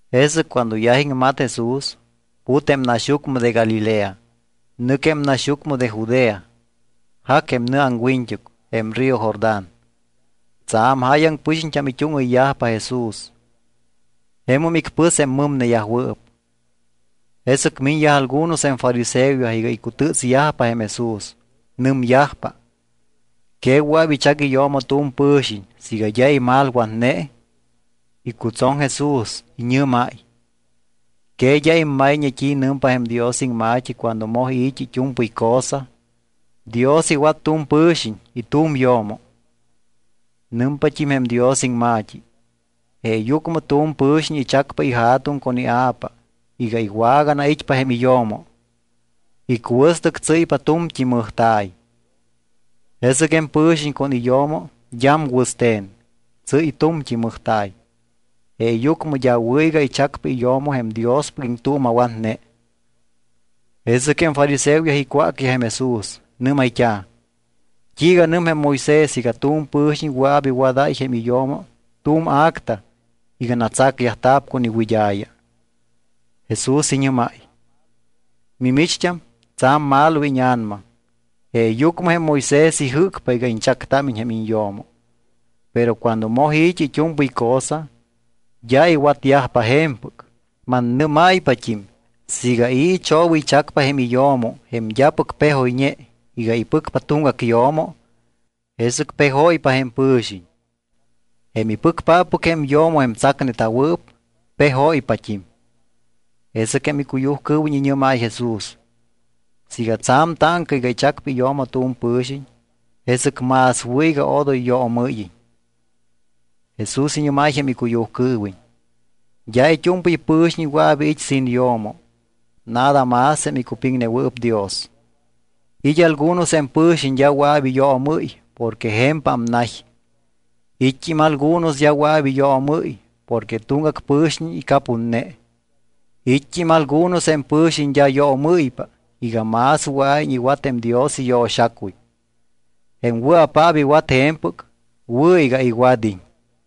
Jesɨc cuando yaj iŋmat Jesús, put jém naxyucmɨ de Galilea, nɨc jém naxyucmɨ de Judea. Jac jém nɨ aŋwiñt́uc, jém río Jordán. Tsa̱m jáyaŋ pɨxiñt́am it́úŋɨyyajpa Jesús. Jemum icpɨs jém mɨmneyajwɨɨp. Jesɨc miñyaj algunos jém fariseoyaj iga icutɨ́tsyajpa jém Jesús. Nɨmyajpa: —¿Que wɨa̱p ichac iyo̱mo tu̱m pɨ̱xiñ siiga d́a imalwatne? Icutsoŋ Jesús. Iñɨ́máy: —¿Que d́a immayñe t́i nɨmpa jém Dios iŋma̱t́i cuando moj i̱t́i it́u̱mpɨy cosa: “Dios iwat tu̱m pɨ̱xiñ y tu̱m yo̱mo”? Nɨmpat́im jém Dios iŋma̱t́i: “Jeeyucmɨ tu̱m pɨ̱xiñ ichacpa ija̱tuŋ con ia̱pa iga iwaganait́pa jém iyo̱mo. Icuɨstɨc tsɨ́ypa tu̱mt́i mɨjta̱y.” Jesɨc jém pɨ̱xiñ con iyo̱mo d́am wɨste̱n. Tsɨ́y tu̱mt́i mɨjta̱y. Jeeyucmɨ d́a wɨ̱ iga ichacpa iyo̱mo jém Diospɨc iŋtuuma̱watne. Jesɨc jém fariseoyaj icwácyaj jém Jesús. Nɨ́mayt́a̱: —¿T́iiga nɨm jém Moisés iga tu̱m pɨ̱xiñ wɨa̱p iwadáy jém iyo̱mo tu̱m acta iga natsacyajta̱p con iwɨd́a̱ya? Jesús iñɨ́máy: —Mimicht́am, tsa̱m malo íña̱nama, jeeyucmɨ jém Moisés ijɨ́cpa iga iñchactámiñ jém iñyo̱mo. Pero cuando moj i̱t́i it́u̱mpɨy cosa, d́a iwatyajpa je̱mpɨc. Mannɨ́máy-pat́im siiga i̱ ichobɨychacpa jém iyo̱mo jém d́apɨc pejoyñe iga ipɨcpa tuŋgac yo̱mo, jesɨc pejóypa jém pɨ̱xiñ. Jém ipɨcpáppɨc jém yo̱mo jém tsacneta̱wɨɨp, pejóypat́im. Jesɨc jém icuyujcɨɨwiñ iñɨ́máy Jesús: —Siiga tsa̱m táŋca iga ichacpa iyo̱mo tu̱m pɨ̱xiñ, jesɨc más wɨ̱ iga odoy yoomɨ́yiñ. Jesús iñɨ́máy jém icuyujcɨɨwiñ: —D́a it́u̱mpɨy pɨ̱xiñ wɨa̱p iit́ sin yo̱mo, nada más jém icupiŋnewɨɨp Dios. It́ algunos jém pɨ̱xiñ d́a wɨa̱p iyoomɨ́y porque je̱mpam nay. It́t́im algunos d́a wɨa̱p iyoomɨ́y porque tuŋgac pɨ̱xiñ icapunne. It́t́im algunos jém pɨ̱xiñ d́a yoomɨ́ypa iga más wɨa̱iñ iwat jém Dios iyo̱xacuy. Jém wɨa̱paap iwat je̱mpɨc wɨ̱ iga iwad́iñ.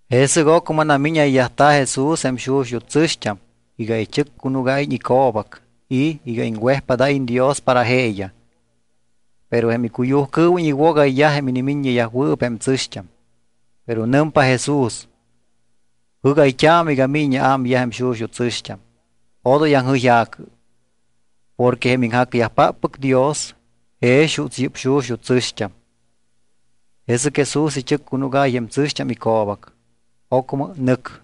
Jesɨc ocmɨ namíñayyajta̱ Jesús jém xuxut́ tsɨ̱xt́am iga ichɨccunúgáyiñ ico̱bac y iga iŋwejpádáyiñ Dios para jeeyaj. Pero jém icuyujcɨɨwiñ iwogayyaj jém inimiññeyajwɨɨp jém tsɨ̱xt́am. Pero nɨmpa Jesús: —Jɨ́gayt́aamɨ iga míñiñ aámyaj jém xuxut́ tsɨ̱xt́am, odoy aŋjɨyja̱cɨ. Porque jém iŋjacyajpáppɨc Dios jex juuts yɨ́p xuxut́ tsɨ̱xt́am. Jesɨc Jesús ichɨccunúgáy jém tsɨ̱xt́am ico̱bac. Ocmɨ nɨc.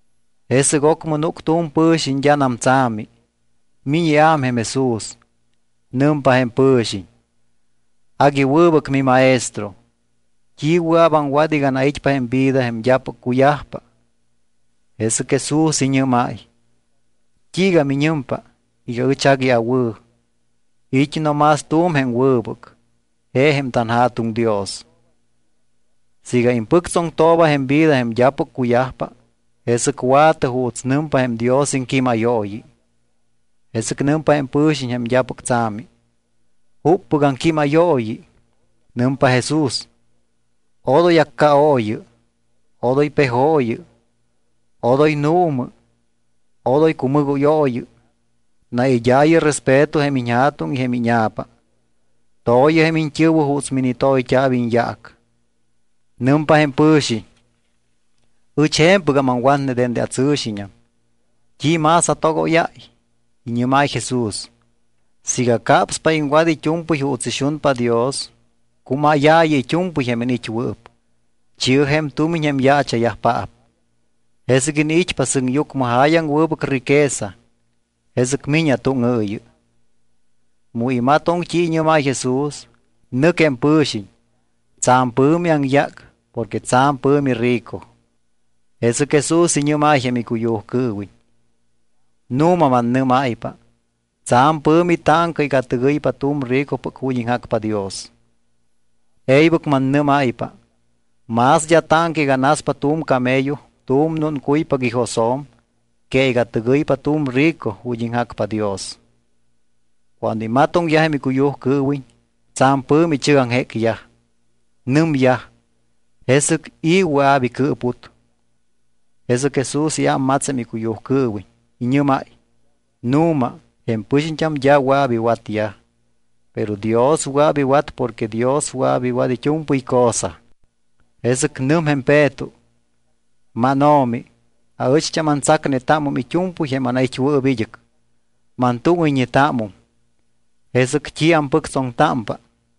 Jesɨc ocmɨ núc tu̱m pɨ̱xiñ d́anam tsa̱mi. Miñ iám jém Jesús. Nɨmpa jém pɨ̱xiñ: —Agui wɨbɨc miMaestro, ¿t́i wɨa̱p aŋwat iga anait́pa jém vida jém d́apɨc cuyajpa? Jesɨc Jesús iñɨ́máy: —¿T́iiga miñɨmpa iga ɨch agui awɨ̱? It́ no más tu̱m jém wɨbɨc, je jém tanJa̱tuŋ Dios. Siiga impɨctsoŋtooba jém vida jém d́apɨc cuyajpa, jesɨc wa̱tɨ juuts nɨmpa jém Dios iŋquímayooyi. Jesɨc nɨmpa jém pɨ̱xiñ jém d́apɨc tsa̱mi: —¿Juppɨc aŋquímayooyi? Nɨmpa Jesús: —Odoy accaooyɨ, odoy pejooyɨ, odoy nuumɨ, odoy cumɨgóyooyɨ. Naid́aayɨ respeto jém iñja̱tuŋ y jém íña̱pa. To̱yɨ jém iñt́ɨ̱wɨ juuts minitoyt́a̱p iñyaac. Nɨmpa jém pɨ̱xiñ: —Ɨch je̱mpɨgam aŋwatne dende atsɨ̱xiñam. ¿T́i más atogóyáy? Iñɨ́máy Jesús: —Siiga capspa iŋwat it́u̱mpɨy juuts ixunpa Dios, cumáyaayɨ it́u̱mpɨy jém iniit́wɨɨp, chi̱ɨ jém tumiñ jém yaacha̱yajpaap. Jesɨc iniit́pa sɨŋyucmɨ jáyaŋ wɨbɨc riqueza. Jesɨc mi̱ñɨ atúŋɨɨyɨ. Mu imatoŋ t́i iñɨ́máy Jesús, nɨc jém pɨ̱xiñ. Tsa̱m pɨ̱mi aŋyác porque tsa̱m pɨ̱mi rico. Jesɨc Jesús iñɨ́máy jém icuyujcɨɨwiñ: —Nu̱ma mannɨ́máypa, tsa̱m pɨ̱mi táŋca iga tɨgɨypa tu̱m ricopɨc ju̱t́ iŋjacpa Dios. E̱ybɨc mannɨ́máypa. Más d́a táŋca iga naspa tu̱m camello tu̱m núncuypac ijosjo̱m que iga tɨgɨypa tu̱m rico ju̱t́ iŋjacpa Dios. Cuando imatoŋyaj jém icuyujcɨɨwiñ, tsa̱m pɨ̱mi ichɨgaŋjécyaj. Nɨmyaj: —¿Jesɨc i̱ wɨa̱p icɨɨput? Jesɨc Jesús iámmats jém icuyujcɨɨwiñ. Iñɨ́máy: —Nu̱ma, jém pɨxiñt́am d́a wɨa̱p iwatyaj, pero Dios wɨa̱p iwat porque Dios wɨa̱p iwat it́u̱mpɨy cosa. Jesɨc nɨm jém Peto: —MánO̱mi, aɨcht́am antsacnetámum it́u̱mpɨy jém anait́wɨɨp id́ɨc, mantúŋɨyñetámum. ¿Jesɨc t́i ampɨctsoŋtámpa?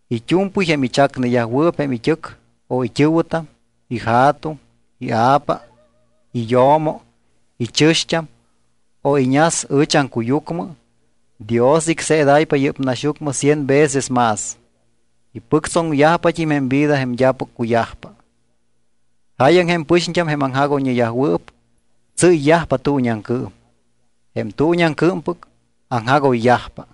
It́u̱mpɨy jém ichacneyajwɨɨp jém it́ɨc, o it́ɨ̱wɨtam, ija̱tuŋ, ia̱pa, iyo̱mo, ichɨ̱xt́am, o iñas ɨch aŋcuyucmɨ, Dios icseedáypa yɨ́p naxyucmɨ cien veces más. Ipɨctsoŋyajpat́im jém vida jém d́apɨc cuyajpa. Jáyaŋ jém pɨxiñt́am, jém aŋjagoyñeyajwɨɨp, tsɨ́yyajpa tuuñiaŋcɨɨm. Jém tuuñiaŋcɨɨmpɨc, aŋjagoyyajpa.